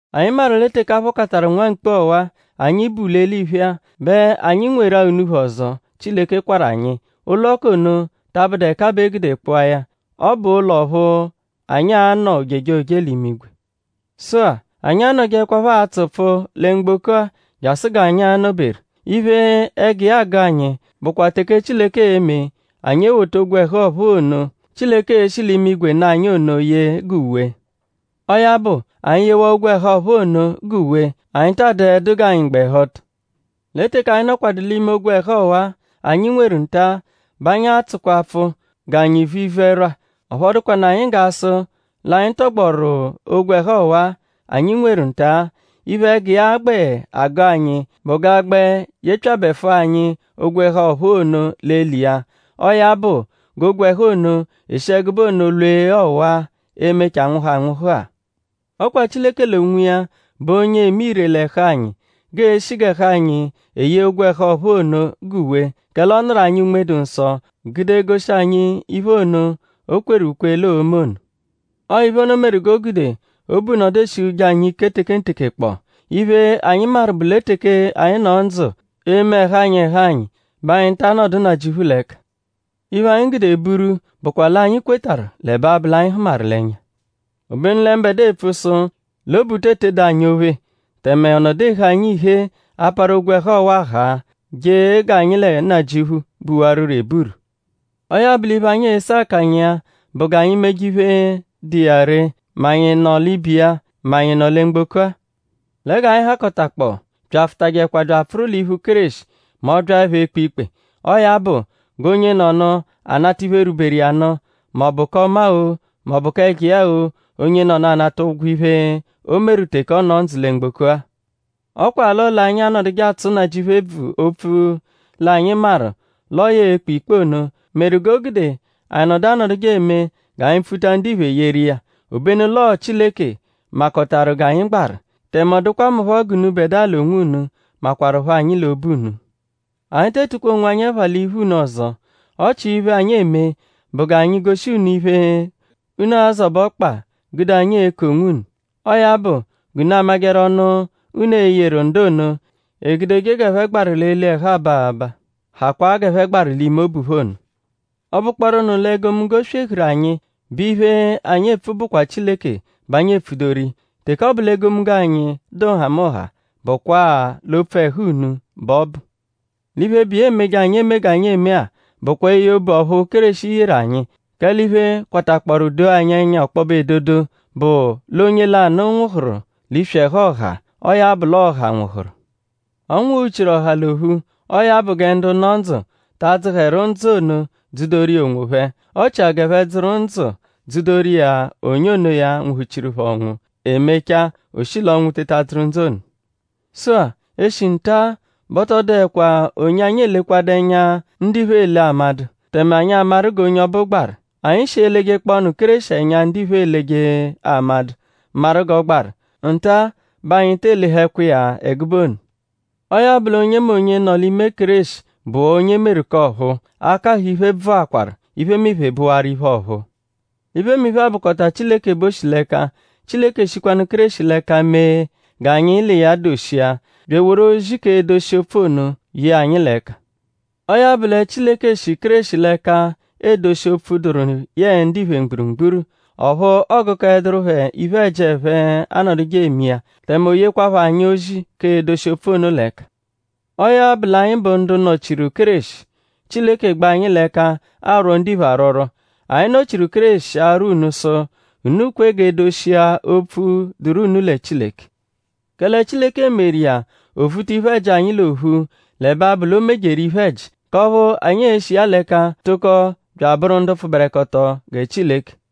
Anyi maru lẹ teke a phọkataru nwa mkpu ọwa-a, anyi bu l'eliphe-a; bẹ anyi nweru-a unuphu ọzo, Chileke kwarụ anyi. Ụlo k'ono ta abụdu ẹka bẹ e gude kpụa ya. Ọ bụ ụlo ọphu anyi a-nọ ojejoje l'imigwe. Sụ-a; anyi a-nọjeekwapho atsụ pfụu lẹ mgboko-a jasụ g'anyi a-nọ-beru. Iphe, ẹgu iya agụ anyi bụkwa teke Chileke e-me anyi ewota ogwẹhu ọ̀phúú ono, Chileke e-shi l'imigwe nụ anyi ono yee g'uwe. Ọo ya bụ; anyi -yewaa ogwẹhu ọ̀phúú ono g'uwe; anyi taa dụedu g'anyi gba ẹhu ọto. Lẹ teke anyi nọkwadu l'ime ogwẹhu ọwa-a, anyi nweru nta-a bẹ anyi atsụkwa pfụu g'anyi vu ivu-ẹrwa; ọphu ọ dụkwanu anyi g'a sụ l'anyi tọgboru ogwẹhu ọwa-a, anyi nweru nta-a. Iphe, ẹgu iya gbẹ agụ anyi bụ g'a gbẹ yepyabẹfua anyi ogwẹhu ọ̀phúú ono l'eli iya. Ọo ya bụ g'ogwẹhu ono eshi ẹgube ono lwee ọwa-a, e-mechaa nwụhu anwụhu-a. Ọ kwa Chileke l'onwiya bụ onye eme ire l'ẹhu anyi g'eeshi g'ẹhu anyi eyee ogwẹhu ọ̀phúú ono g'uwe; kẹle ọ nụru anyi Unme-dụ-Nsọ gude goshi anyi iphe ono, o kweru ukwe l'oo-me ono. Ọo iphe ono meru g'o gude obu nọdu eshihuje anyi ike tekenteke kpọo. Iphe, anyi maru bụ lẹ teke anyi nọ ndzụ eme ẹhu anyi ẹhu anyi bẹ anyi ta anọdu Nnajịuphu l'ẹka. Iphe, anyi gude buru bụkwa l'anyi kwetarụ l'ẹbe abụ l'anyi hụmaru l'ẹnya. Obenu lẹ mbẹdua epfu sụ l'obu te etedu anyi ophe; tẹme ọ nọdu ehe anyi ihee aparu ogwẹhu ọwa-a haa; je g'anyi lẹ Nnajịuphu buwarụro eburu. Ọo ya bụ l'iphe, anyi ese akanya iya bụ g'anyi meje iphe, dụ iya ree; mẹ anyi nọ l'ibe iya; mẹ anyi nọ lẹ mgboko-a. Lẹ g'anyi hakọtakpoo; byafụtajekwa bya apfụru l'iphu Kéreshi mẹ ọ -byaẹpho ekpe ikpe. Ọo ya bụ; g'onyenọnu a-nata iphe, rwuberu iya nụ; m'ọ bụ k'ọma-o; m'ọ bụ ẹjo iya-o; onyenọnu anata ụgwo iphe, o meru teke ọ nọ ndzụ lẹ mgboko-a. Ọ kwa l'ọo l'anyi anọduje atsụ Nnajịuphu ebvu opfu l'anyi maru l'ọo ya e-kpe ikpe ono meru g'o gude anyi nọdu anọduje eme g'anyi pfuta ndiphe yeru iya. Obenu l'ọo Chileke makọtaru g'anyi gbaru; tẹme ọ dụkwa mu phọ g'unubẹdua l'onwunu makwaruphọ anyi l'obu unu. Anyi te etukwa onwanyi ẹpha l'iphu unu ọzo; ọ chia iphe, anyi eme bụ g'anyi goshi unu iphe, unu a-zọbe ọkpa gude anyi eku onwunu; ọo ya bụ g'unu a-majẹru ọnu, unu e-yeru ndu ono, egudeje g'ẹphe gbaru l'eli ẹhu aba abaa; hakwaa g'ẹphe gbaru l'ime obu phẹ ono. Ọ -bụkpooru nụ l'ọo egomunggo swehuru anyi bẹ iphe, anyi epfu bụkwa Chileke bẹ anyi epfudoru iya. Teke ọ bụ l'egomunggo anyi dụa nhamụnha bụkwa-a l'opfu ẹhu unu bẹ ọ bụ. L'iphe, bụ iya emeje anyi eme g'anyi eme-a bụkwa eye obu ọphu Kéreshi yeru anyi. Kẹle iphe, kwatakpọoru doo anyi ẹnya ọkpobe edodo bụ l'ọo onye lanụ nwụhuru l'iswi ẹhu ọha. Ọo ya bụ l'ọo ọha nwụhuru. Ọ nwụhu-chiru ọha l'ophu. Ọo ya bụ gẹ ndu nọ ndzụ ta adzụheru ndzụ ono dzụ-doru iya onwophẹ. Ọ chia g'ẹphe dzụru ndzụ dzụ-doru iya onye onoya, nwụhu-chiru phẹ ọnwu; e mechaa o shi l'ọnwu teta dzụru ndzụ ono. Sụ-a; eshi nta-a bẹ ọ tọ dụekwa onye anyi elekwadu ẹnya, ndiphe ele amadụ; tẹme anyi amaru g'onye ọbu gbaru. Anyi -shi elejekpọonu Kéreshi ẹnya, ndiphe eleje amadụ maru g'ọ gbaru; nta-a bẹ anyi te elehẹkwa iya ẹgube ono. Ọo ya bụ l'onyemonye, nọ l'ime Kéreshi bụwaa onye e meru k'ọ̀phúú. Akahụ iphe bvụakwaru; iphemiphe bụwaru iphe ọ̀phúú! Iphemiphe-a bụkota Chileke bẹ o shi l'ẹka. Chileke shikwanụ Kéreshi l'ẹka mee g'anyi l'iya doshia; bya eworu ozi k'edoshi opfu ono ye anyi l'ẹka. Ọo ya bụ lẹ Chileke shi Kéreshi l'ẹka edoshi opfu dụru yẹe ndiphe mgburugburu; ọphu ọogukoeduru phẹ iphe-ẹji, ẹphe anọduje eme iya. Tẹme o yekwaaphọ anyi ozi k'edoshi opfu ono l'ẹka. Ọo ya bụ l'anyi bụ ndu nọ-chiru Kéreshi. Chileke gbẹ anyi l'ẹka arwọ ndiphe arwọrwo. Anyi nọ-chiru Kéreshi arwọ unu sụ: unu kwe g'e doshia opfu, dụru unu lẹ Chileke. Kẹle Chileke meru iya o vuta iphe-ẹji anyi l'ophu l'ẹbe abụ l'o mejeru iphe-ẹji; k'ọphu anyi e-shi iya l'ẹka tụko bya abụru ndu pfụberekoto gẹ Chileke.